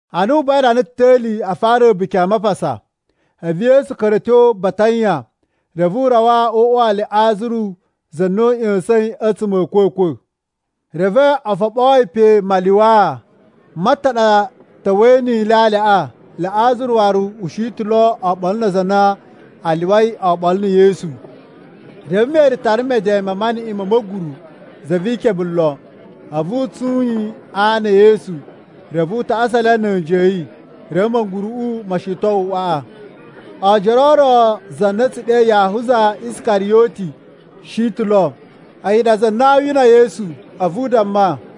Ana u buwai rana ta̱li a fara A̱buki a Mapasa, a̱vu Yesu ka̱ra̱ a̱ tyo Batanya, reve u rawa o uꞌwa wa Liꞌazaru, za na u ꞌya̱sa̱in a̱tsuma̱ a̱ a̱a̱kwa̱kwa̱. Reve o foɓoo yi pe malyuwaa. Marta ɗa ta̱wa̱i ni ilyalyaꞌa, Liꞌazaru waru u shi ta̱ oɓolo na aza a na a lyuwai oɓolo na̱ Yesu. Reve Meri tara meden ma maniꞌin ma̱ ma̱guru, za vi ikebe lon, a̱vu u tsun yi a ana e Yesu. Reve u tasa le na̱ a̱nji a̱ yi. Reve ma̱guru mo shiton uꞌwaꞌa. Oojoro o ro za na a̱ tsu ɗe Yahuza Iskariyoti shi ta̱ lo. A̱yi ɗa za na aa wina Yesu, a̱vu u damma,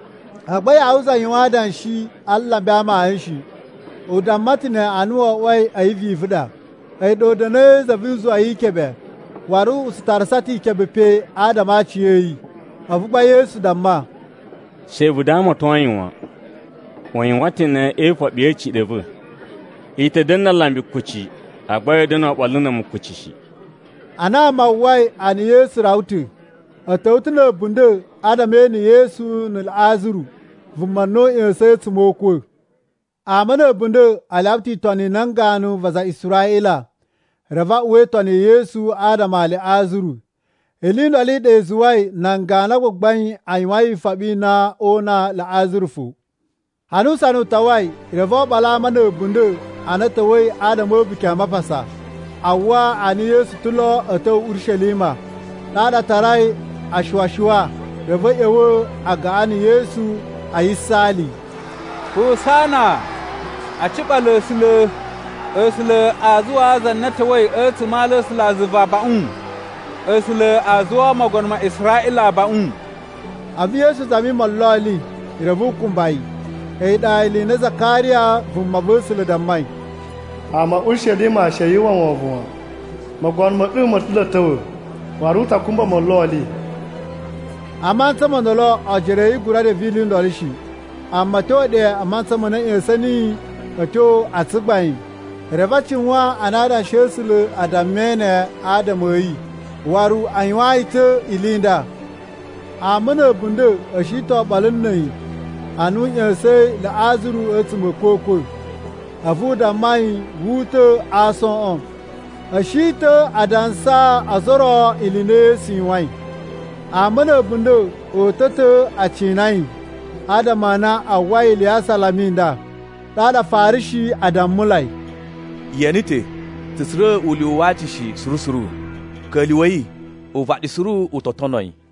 Agba Yahuza yuwan adanshi a alambi na amayun shi. U damma ta̱ ne ana wo oꞌwoi a̱yi vivu ɗa. A̱yi ɗa u da̱na̱i za vu uzuwa wi ikebe, waru u tsu tarasa ta̱ ikebe pe adama a aciya̱yi. A̱vu gba Yesu damma, “She vu damaton yi wan. U yuwan ta̱ ne e ifoɓi ya̱ a̱ciɗa̱ a̱ va̱. I ta̱ da̱na̱ na alambi kuci, agba ya̱a̱ da̱na̱ oɓolo na̱ a̱mu kuci shi.” Ana ama a uwwai a na Yesu rawa ta̱, a̱ ta̱wa̱ ta̱ na̱ a̱bunda̱ adama e ene Yesu na̱ Liꞌazaru, vuma na u ꞌya̱sa̱in a̱tsuma̱ o ukwa̱. Ama na̱ a̱bunda̱ a lyawa ta̱ itoni i nan ganu va aza a Israꞌila, reve a uwa itoni ya̱ Yesu adama a Liꞌazaru. Ili i ndolo i ɗa i zuwai nan ganu a gbagbain a yuwain ifoɓi i na oo una Liꞌazaru fo. Ana usana u tawai, reve oɓolo a ama na̱ a̱bunda̱ a na a̱ ta̱wa̱i adama a̱ A̱buki a Mapasa a uwwa a na Yesu ta̱ lo a̱ ta̱wa̱ Urishelima. Ɗaɗa a tarai ashuwa-shuwa reve a̱ ꞌya̱wa̱ a gaꞌan na̱ Yesu, a yisaali, “Husana! A ciɓala A̱sula̱!” “A̱sula̱ a zuwaa za na ta̱wa̱i a̱tsuma̱ a ala a̱ A̱sulazuva abaꞌun!” “A̱sula̱ a zuwaa Mogono ma Israꞌila abaꞌun!” A̱vu Yesu zami molloli reve u kumba yi. A̱yi ɗa ili i na Zakariya vumava̱sula̱ dammai, “Ama a̱ Urishelima she yu uwwa wovon wan! Mogono ma̱ ɗu mo ta̱ lo a̱ ta̱wa̱, waru u ta kumba molloli.” A mantsa mo ndolo, ojoro a̱ yi a gura reve ili i ndolo shi. Amma a̱ tyo ɗe a mantsa ma na a̱ ꞌya̱sa̱n niyi a̱ tyo a tsugbain, reve a cuwan a na Adanshi a̱ A̱sula̱ a dammai ne adama a̱ yi, waru a yuwaan yi ta̱ ili i nda. Ama na̱ a̱bunda̱ a̱ shi ta̱ oɓolo na̱ a̱yi, ana u ꞌya̱sa̱in Liꞌazaru a̱tsuma̱ a̱ a̱kwa̱kwa̱, a̱vu u damma yi wu uta̱ a aason. A̱ shi ta̱ a dansaa ozo o ro ili i na Yesu yuwain. Ama na̱ a̱bunda̱ o uta̱ ta̱ aa cina yi, adama a na a uwwai ili ya asalama i nda. Ɗaɗa Afarishi a dammulai, “Ye ene ta̱, tsu tsura̱ ulyuwu wa aci shi suru suru! Ka̱lyuwa̱i, uvaɗi suru u to tono yi!”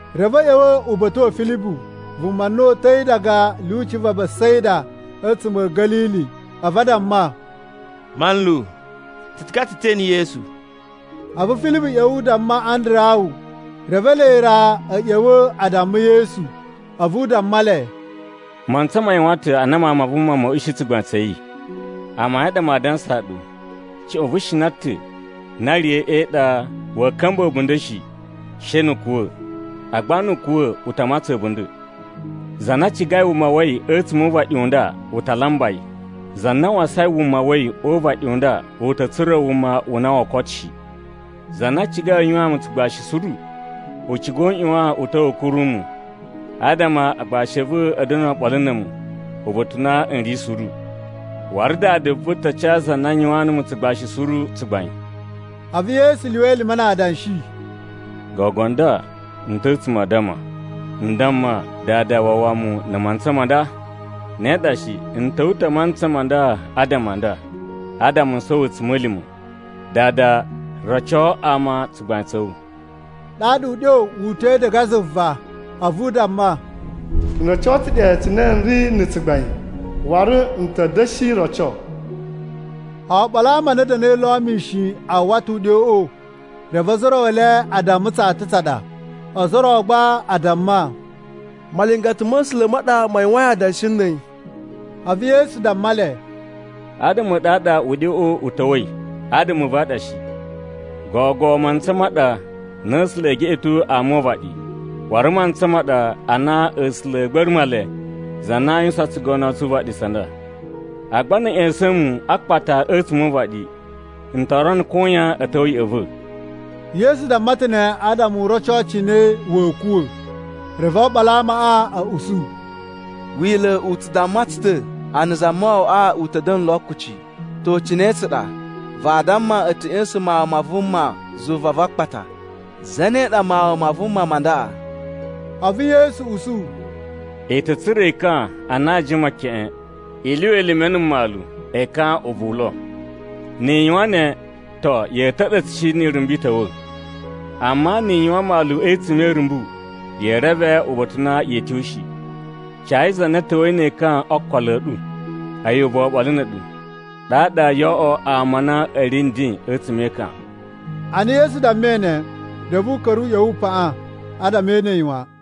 Reve a̱ ꞌya̱wa̱ uba̱ta̱ wa̱ Filibu (vuma na uta̱i diga a̱ lyuci va Besaida a̱tsuma̱ a̱ Ga̱lili) a̱vu a damma, “Manlu, tsu ciga ta̱ tse ene Yesu.” A̱vu Filibu ꞌya̱wa̱ u damma Andarawu, reve ele ra a̱ ꞌya̱wa̱ a damma Yesu. A̱vu u damma le, “Mantsa ma yuwan ta̱ ana Mawun ma Vuma ma̱a̱ ushi tsugbain tsa̱ yi. Amayun a ɗa maa dansaa ɗu, cuꞌun vu shina ta̱ na riya̱i e iɗa waa ka̱mba̱ a̱bunda̱ shi, she nu u kuwa̱. Agba nu u kuwa̱, u ta matsan a̱bunda̱. Za na cigai wuma wa̱ yi a̱tsuma̱ o uvaɗi u nda u ta lamba yi. Za na wasain wuma wa̱ yi o uvaɗi u nda u ta̱ tsura̱ wuma u na woo koto shi. Za na cigai u yuwaan mu tsugbashi suru, u ciga u ꞌyuwan u ta̱wa̱ u kuru mu, adama aagbashi a̱ va̱ a̱ da̱na̱ oɓolo na̱ a̱mu uba̱ta̱ u na n ri suru. Waru Dada va̱ ta ca za na yuwaan numu tsugbashi suru tsugbain.” A̱vu Yesu lyuwa elime na adanshi, “Gogo nda n ta̱ a̱tsuma̱ a addama. N damma, ‘Dada wawa mu na̱ mantsa ma nda?’ Ne ɗa shi, n ta̱wa̱ ta̱ a mantsa ma nda adama a nda, adama n sowo a̱tsuma̱lima̱. Dada, roco ama tsugbain tsa̱ wu!” Ɗaɗa uɗyo wu uta̱i diga zuva a̱vu u damma, “N roco ta̱ ɗe cine n ri na̱ tsugbain waru n ta̱ da̱shi roco.” Oɓolo a ama a na a̱ da̱na̱i lo mishin a uwwa ta̱ uɗyoꞌo, reve ozo o ro e le a damma tsata tsa ɗa. Ozo o ro gba a damma, “Malingata ma̱ A̱sula̱ ma ɗa ma yuwain adanshi na̱ a̱yi!” A̱vu Yesu damma le, “Adama a̱ ɗu a ɗa uɗyoꞌo u ta̱wa̱i, adama a̱ va̱ a ɗa shi. Gogo mantsa ma ɗa na A̱sula̱ e geꞌeto ama o uvaɗi. Waru mantsa ma ɗa ana A̱sula̱ a̱a̱ gba̱ra̱ Male za na aa yuwusan tsugono tsu uvaɗi tsa nda. Agba na̱ a̱ ꞌya̱sa̱n mu a akpata a̱tsuma̱ o uvaɗi, n to rono koyan a̱ ta̱wa̱ ya̱ꞌa̱ va̱.” Yesu damma ta̱ ne adama u roco cine wa̱a̱ kuwa̱. Reve oɓolo a amaꞌa a̱ usu, “Wila̱ u tsu u damma tsu ta̱ a na Zamawawaꞌa u ta̱ da̱na̱ lo kuci. To, cine tsa ɗa, vaa damma a̱ ta̱ ꞌya̱sa̱n Mawun ma Vuma zuva va akpata? Zane ɗa Mawun ma Vuma ma ndaꞌa?” A̱vu Yesu usu, “I ta̱ tsura̱ ekan a na a jima keꞌen. I lyuwa elime na̱ mmalu ekaꞌan ubuwu lo. Ni i yuwan ne, to, ya̱a̱ ta̱ɗa̱tsa̱ shi ni irumbu i ta̱wa̱. Amma ni i yuwan mmalu a̱tsuma̱ e irumbu, yee reve uba̱ta̱ u na yee tyo shi. Cayi za na ta̱wa̱i ne ekan okolo a̱ ɗu, a̱yi ubuwu oɓolo na̱ a̱ɗu. Ɗaɗa yoo oꞌwo ama a na a̱ ri nden a̱tsuma̱ e ekan.” Ana Yesu dammai ne, reve u ka̱ra̱ u ꞌya̱wa̱ u paꞌan adama e ene yi wan.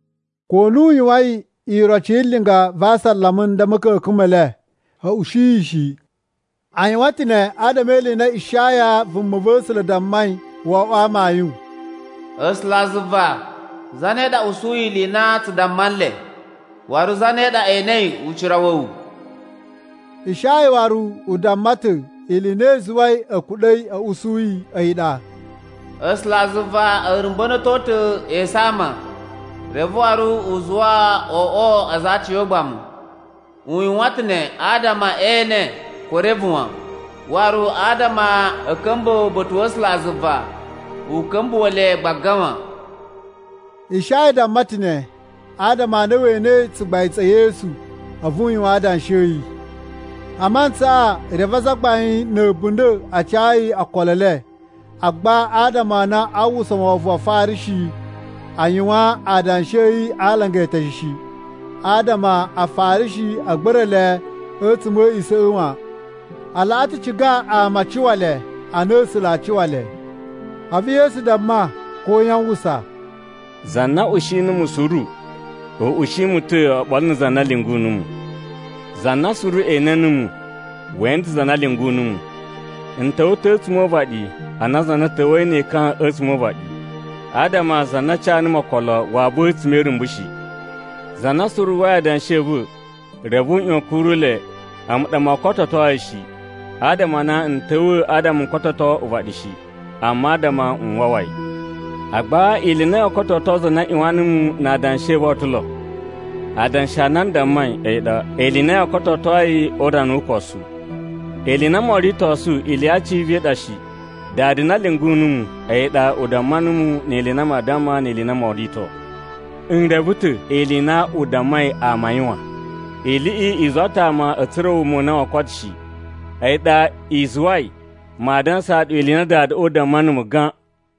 Ko na u yuwain iroci yi linga va asalama a nda a̱ ma̱ka̱ka̱n me le, a̱ ushi yi shi. A yuwan ta̱ ne adama e ili i na Ishaya vumava̱sula̱ dammai wo oꞌwo amayun, “A̱sulazuva, zane ɗa usuyi ili i na tsu damma nle? Waru zane ɗa enei ucira wa̱ wu?” Ishaya waru u damma ta̱ ili i na i zuwai a̱ kuɗa̱i a̱ usu a̱yi ɗa: “A̱sulazuva a̱ rumba̱na̱to ta̱ esu a ama, reve waru u zuwa o oꞌwo aza a aciyogbamu. U yuwan ta̱ ne adama e ene ko e reve wan, waru adama a̱ ka̱mba̱ uba̱ta̱ wa̱ A̱sulazuva u ka̱mbuwa̱ le gbaga wan.” Ishaya damma ta̱ ne, adama a na we enei tsugbain tsa̱ Yesu, a̱vu u yuwan adanshi a̱ yi. A mantsaꞌa, reve azagbain na̱ a̱bunda̱ a ca yi okolo e le. Agba adama a na aa uwwusa wovon wa Afarishi, a yuwan adanshi a̱ yi a alanga eteshe shi, adama Afarishi a̱ gba̱ra̱ le a̱tsuma̱ a̱ a̱a̱ꞌisa̱ꞌa̱ wan. A laꞌa ta̱ ciga ama a cuwa le a na A̱sula̱ a cuwa le. A̱vu Yesu damma koyan a uwwusa, “Za na ushi numu suru, u ushi mu ta̱ oɓolo na̱ za na lyungu numu. Za na suru ene numu, we ene ta̱ za na lyungu numu. N ta̱wa̱ ta̱ a̱tsuma̱ o uvaɗi ana za na ta̱wa̱yi ne ekan a̱tsuma̱ o uvaɗi, adama za na ca numu okolo waa buwa a̱tsuma̱ e irumbu shi. “Za na suru uwwai adanshi a̱ va̱, reve u ꞌyuwan a̱ kuru le, a̱mu ɗa moo kototo yi shi. Adama a na n ta̱wa̱ adama n kototo uvaɗi shi, amma adama n wawa yi. Agba ili i na yoo kototo za na ꞌyuwan numu na adanshi a̱ va̱ o ta̱ lo. Adanshi a na n dammai, a̱yi ɗa ili i na yoo kototo yi o urana wu ukosu. Ili i na moo ritosu ili ya aciya̱va̱ i ɗa shi. Dada na lyungu numu, a̱yi ɗa u damma numu ili i na maa damma ni ili i na moo rito. N reve ta̱ ili i na u dammai ama a yuwan, iliꞌi i zuwa ta̱ ama a̱ tsura̱ wuma u na woo koto shi. A̱yi ɗa i zuwai maa dansaa ɗu ili i na Dadaꞌa u damma numu gan.”